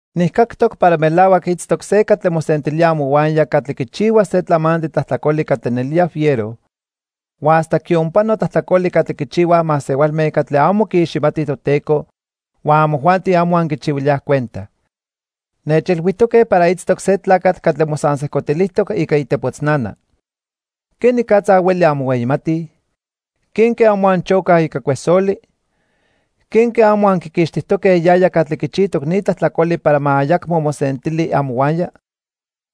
Nijcactoc para melahuac itztoc se catli mosentilía amohuaya catli quichihua se tlamantli tlajtlacoli catli nelía fiero, huan hasta quionpano tlajtlacoli catli quichihuaj masehualme catli amo quiiximatij Toteco huan amojuanti amo anquichihuilíaj cuenta. Nechilhuijtoque para itztoc se tlacatl catli mosansejcotilijtoc ica itepotznana. ¿Quenicatza hueli anmohueyimatij? ¿Quenque amo anchocaj ica cuesoli? ¿Quenque amo anquiquixtijtoque yaya catli quichijtoc ni tlajtlacoli para ma ayacmo mosentili amohuaya?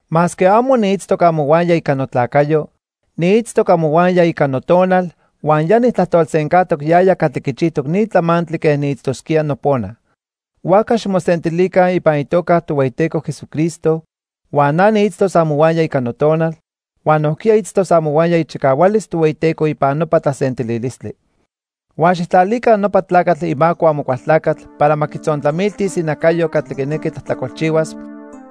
Masque amo niitztoc amohuaya ica notlacayo, niitztoc amohuaya ica notonal, huan ya nijtlajtolsencajtoc yaya catli quichijtoc ni tlamantli quen niitztosquía nopona. Huajca ximosentilica ipan itoca Tohueyiteco Jesucristo huan na niitztos amohuaya ica notonal, huan nojquiya itztos amohuaya ichicahualis Tohueyiteco ipan nopa tlasentililistli. Huan xijtlalica nopa tlacatl imaco Amocualtlacatl para ma quitzontlamiltis inacayo catli quinequi tlajtlacolchihuas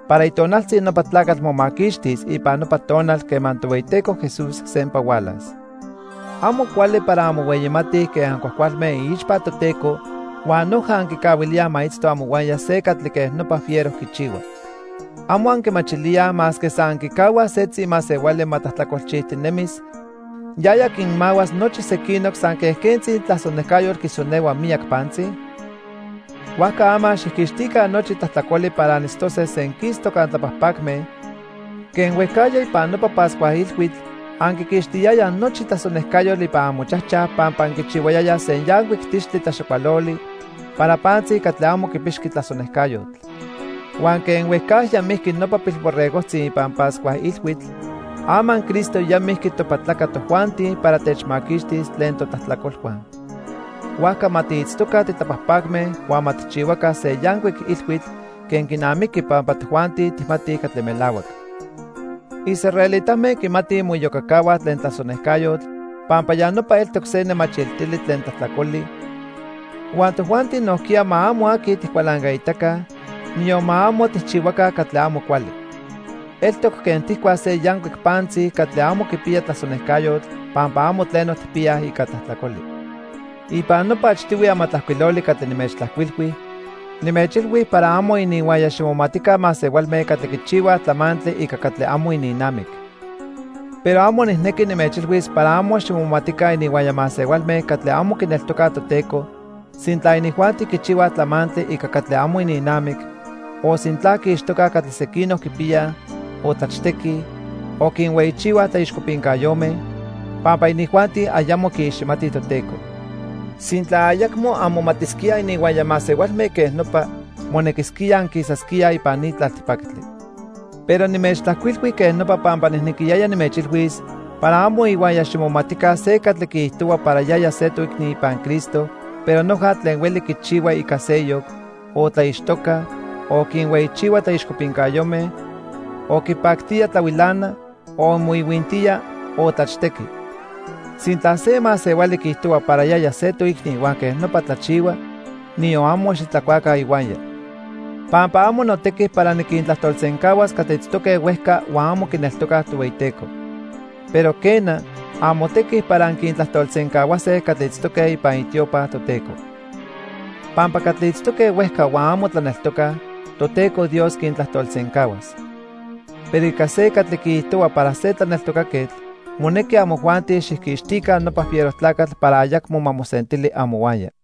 para itonaltzi nopa tlacatl momaquixtis ipan nopa tonal quema Tohueyiteco Jesús sempa hualas. Amo cuali para anmohueyimatij quen ancuajcualme iixpa Toteco huan noja anquicahuilíaj ma itzto amohuaya se catli quej nopa fiero quichihua. ¿Amo anquimachilíaj masque san anquicahuaj setzi masehuali ma tlajtlacolchijtinemis, yaya quinmahuas nochi sequinoc san quen quentzi tlasonejcayotl quisonehua miyac pantzi? Huajca ama xijquixtica nochi tlajtlacoli para anitztose senquistoc antlapajpacme quen huejcajya ipan nopa Pascua Ilhuitl anquiquixtiyayaj nochi tlasonejcayotl ipan amochajchaj pampa anquichihuayayaj se yancuic tixtli tlaxacualoli para pantzi catli amo quipixqui tlasonejcayotl. Huan quen huejcajya mijqui nopa pilborregojtzi ipan Pascua Ilhuitl, ama Cristo ya mijqui topatlaca tojuanti para techmaquixtis tlen totlajtlacolhua. Huajca ma tiitztoca titlapajpacme huan ma tijchihuaca se yancuic ilhuitl quen quinamiqui pampa tojuanti tijmatij catli melahuac. Israelitame quimatij moiyocacahuaj tlen tlasonejcayotl pampa ya nopa eltoc se nemachiltili tlen tlajtlacoli, huan tojuanti nojquiya ma amo aqui tijcualancaitaca, niyon ma amo tijchihuaca catli amo cuali. Eltoc quen tijcuaj se yancuic pantzi catli amo quipiya tlasonejcayotl pampa amo tleno tijpiyaj ica tlajtlacoli. Ipan nopa achtihui amatlajcuiloli catli nimechtlajcuilhui, nimechilhui para amo ininhuaya ximomatica masehualme catli quichihuaj tlamantli ica catli amo ininnamic. Pero amo nijnequi nimechilhuis para amo ximomatica ininhuaya masehualme catli amo quineltocaj Toteco sintla inijuanti quichihuaj tlamantli ica catli amo ininnamic, o sintla quiixtocaj catli sequinoc quipiyaj, o tlachtequij, o quinhueyichihuaj tlaixcopincayome, pampa inijuanti ayamo quiiximatij Toteco. Sintla ayacmo anmomatisquíaj ininhuaya masehualme quej nopa, monequisquía anquisasquíaj ipan ni tlaltipactli. Pero nimechtlajcuilhui quej nopa pampa nijnequiyaya nimechilhuis para amo ihuaya ximomatica se catli quiijtohua para yaya se toicni ipan Cristo pero noja tlen hueli quichihua ica seyoc, o tlaixtoca, o quinhueyichihua tlaixcopincayome, o quipactía tlahuilana, o moihuintía o tlachtequi. Sintla se masehuali quiijtohua para yaya se toicni huan quej nopa tlachihua, niyon amo xitlacuaca ihuaya. Pampa amo notequi para niquintlajtolsencahuas catli itztoque huejca huan amo quineltocaj Tohueyiteco. Pero quena, amotequi para anquintlajtolsencahuase catli itztoque ipan itiopa Toteco. Pampa catli itztoque huejca huan amo tlaneltocaj, Toteco Dios quintlajtolsencahuas. Pero ica se catli quiijtohua para se tlaneltocaquetl, monequi amojuanti xijquixtica nopa fiero tlacatl para ayacmo ma mosentili amohuaya.